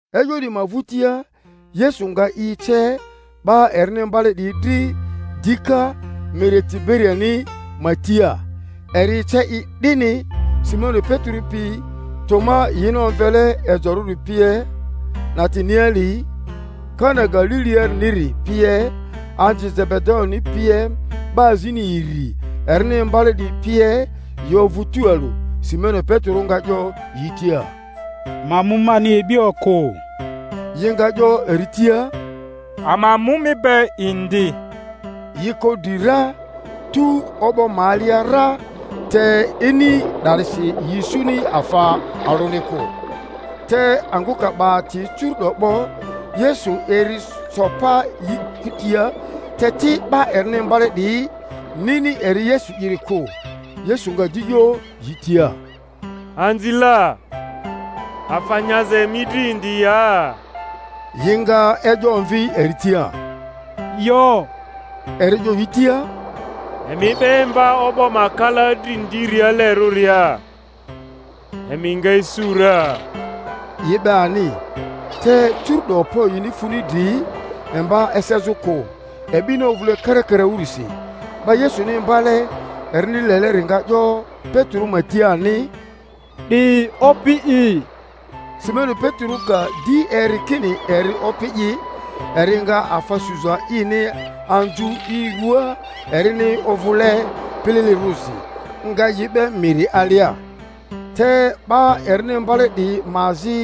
E'yo 'diyi ma vᴜtia Yesu nga i ece 'ba erini imbale 'diyi dri dika miri Tiberiani ma tia; eri ece i 'dini. Simoni Petero pi, Toma yi-ni omvele Ejorᴜri pie, Natanieli Kana Galiliariniri pie, anzi Zebedayoni pie, 'ba azini iri erini imbale 'diyi pie yi ovᴜ tualᴜ. Simoni Petero nga 'yo yi tia, Ma mu mani e'bi okᴜ. Yi nga 'yo eri tia, Ama mu mi be indi. Yi ko dri ra, tu o'bo ma alia ra; te ini 'darisi yi isuni afa alᴜni kᴜ. Te angᴜ ka 'ba ati curu'do 'bo, Yesu eri so pa yi kutia; te ti 'ba erini imbale 'diyi nini eri Yesu'iri kᴜ. Yesu nga di 'yo yi tia, Anzi la, afa nyaza emi dri indi ya? Yi nga e'yo omvi eri tia, Yo. Eri 'yo yi tia, Emi 'be emba o'bo ma kala dri ndialerᴜria, emi nga isu ra. Yi 'be ani, te curu'do okpo yini funi dri emba esezᴜ kᴜ, e'bini ovᴜle karakaraᴜrisi. 'Ba Yesuni imbale erini leleri nga 'yo Petero ma tia ani, 'Di Opi'i! Simoni Petero ka di eri kini eri Opi'i, eri nga afa suza ini anzu i ruaa erini ovᴜle pililirᴜrisi, nga i 'be miri alia. Te 'ba erini imbale 'diyi ma azi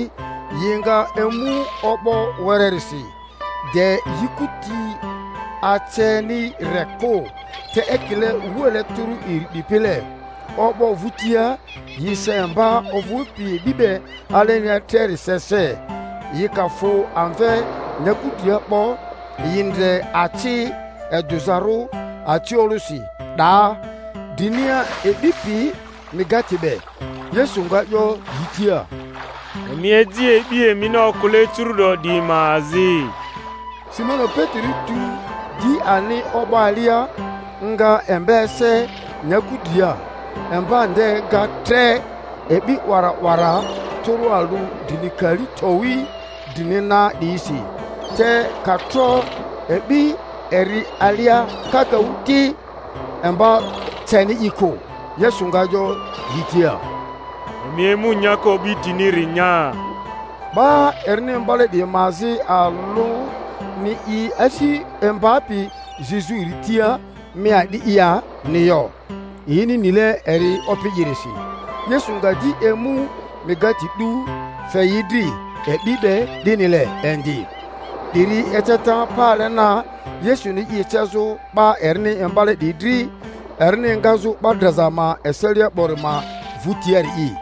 yi nga emu o'bo wererisi, de yi kuti aceni re kᴜ, te ekile wuale tᴜrᴜ iri 'dipile; o'bo vᴜtia yi se emba ovᴜpi e'bi be alenia treri se se. Yi ka fᴜ amve nyaku dria 'bo, yi ndre aci edᴜzarᴜ aciolᴜsi 'daa, drinia e'bi pi mikate be. Yesu nga 'yo yi tia, Emi eji e'bi emini okᴜle curu'do 'diyi ma azi. Simoni Petero tu di ani o'bo alia, nga emba ese nyaku dria. Emba nde ga tre e'bi 'wara 'wara tᴜrᴜ alᴜ drini kali towi drini na 'diyisi; te ka tro e'bi eri alia kakaᴜ ti, emba ceni i kᴜ. Yesu nga 'yo yi tia, Emi emu nyaka o'bitiniri nya. Ba erini mbale 'diyi ma azi alᴜni i asi imbapi zizᴜ eri tia, Mi a'di'i ya?-ni yo, yini nile eri Opi'irisi. Yesu nga di emu mikate 'du, fe yi dri, e'bi be 'dinile indi. 'Diri eceta pale na Yesuni i ecezᴜ 'ba erini imbale 'diyi dri, erini engazᴜ 'ba draza ma eselia 'bori ma vᴜtiari'i.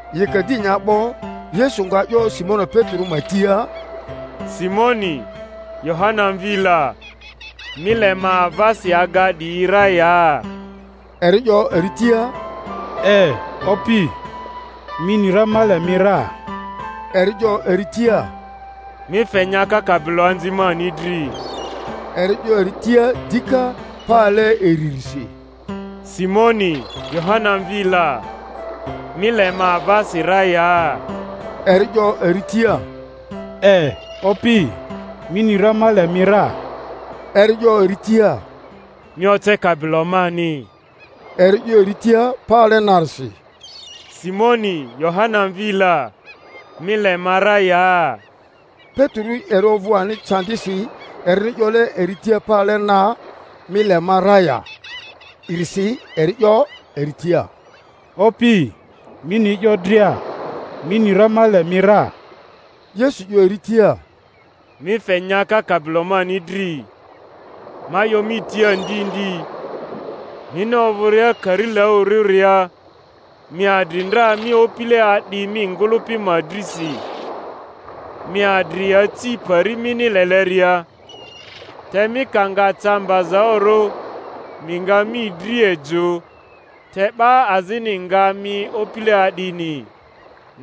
Yi ka di nya 'bo, Yesu nga 'yo Simoni Petero ma tia, Simoni, Yohana mvi la, mi le ma avasi aga 'diyi ra ya? Eri 'yo eri tia, E, Opi; mi ni ra ma le mi ra. Eri 'yo eri tia, Mi fe nyaka kabiloanzi mani dri. Eri 'yo eri tia dika pale iririsi, Simoni, Yohana mvi la, mi le ma avasi ra ya? Eri 'yo eri tia, E, Opi; mi ni ra ma le mi ra. Eri 'yo eri tia, Mi oce kabilo mani. Eri 'yo eri tia pale narisi, Simoni, Yohana mvi la, mi le ma ra ya? Petero eri ovᴜ ani candisi erini 'yole eri tia pale na, Mi le ma ra ya?-risi. Eri 'yo eri tia, Opi, mi ni e'yo dria; mi ni ra ma le mi ra. Yesu 'yo eri tia, Mi fe nyaka kabilo mani dri. Ma 'yo mi tia ndi ndi, mini ovᴜria karilaᴜrᴜria mi adri ndra mi opile a'di mi ngᴜlᴜpi ma drisi, mi adri aci pari mini leleria; te mi ka nga ca mbazaᴜrᴜ mi nga mi dryi ejᴜ, te 'ba azini nga mi opile a'dini,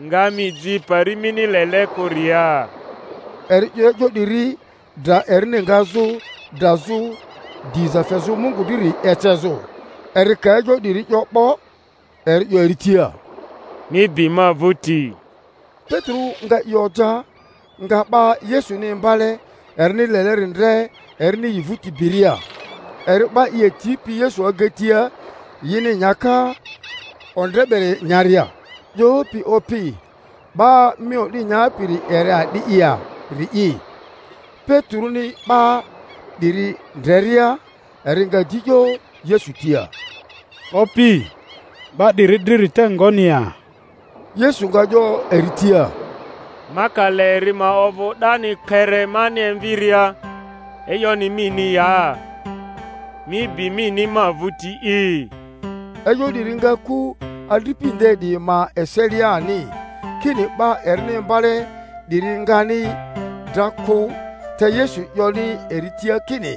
nga mi ji pari mini lele kᴜria. (Eri 'yo e'yo 'diri, dra erini ngazᴜ drazᴜ diza fezᴜ Mungu driri ecezᴜ.) Eri ka e'yo 'diri 'yo 'bo, eri 'yo eri tia. Mi bi ma vᴜti. Petero nga i oja, nga 'ba Yesuni imbale erini leleri ndre erini yi vᴜti biria, eri 'ba i atipi Yesu agatia yini nyaka ondre beri nyaria, 'yopi, Opi, 'ba mi o'di nyapiri eri a'di'i ya?-ri'i. Peteroni 'ba 'diri ndreria eri nga di 'yo Yesu tia, Opi, 'ba 'diri driri te ngoni ya? Yesu nga 'yo eri tia, Ma ka le eri ma ovᴜ 'dani kpere mani emviria, e'yoni mini ya? Mi bi mini ma vᴜti'i! E'yo 'diri nga ku adripi nde 'diyi ma eselia ani, kini 'ba erini imbale 'diri ngani dra kᴜ; te Yesu 'yoni eri tia kini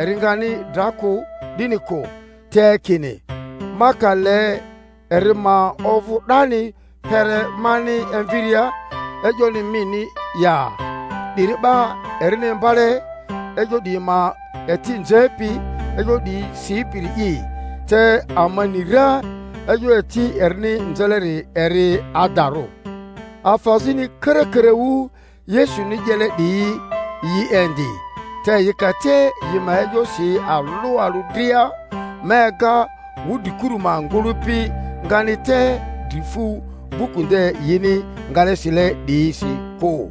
eri ngani dra kᴜ, 'dini kᴜ, te kini, Ma ka le eri ma ovᴜ 'dani kpere mani emviria, e'yoni mini ya? 'Diri 'ba erini imbale e'yo 'diyi ma eti nzepi, e'yo 'diyi sipiri'i; te ama ni ra e'yo eti erini nzeleri eri adarᴜ. Afa azini karakaraᴜ Yesuni 'yele 'diyi yi indi, te yi ka te yi ma e'yo si alᴜ alᴜ dria, ma ega wudrikuru ma ngᴜlᴜpi ngani te dri fu buku nde yini ngale sile 'diyisi kᴜ.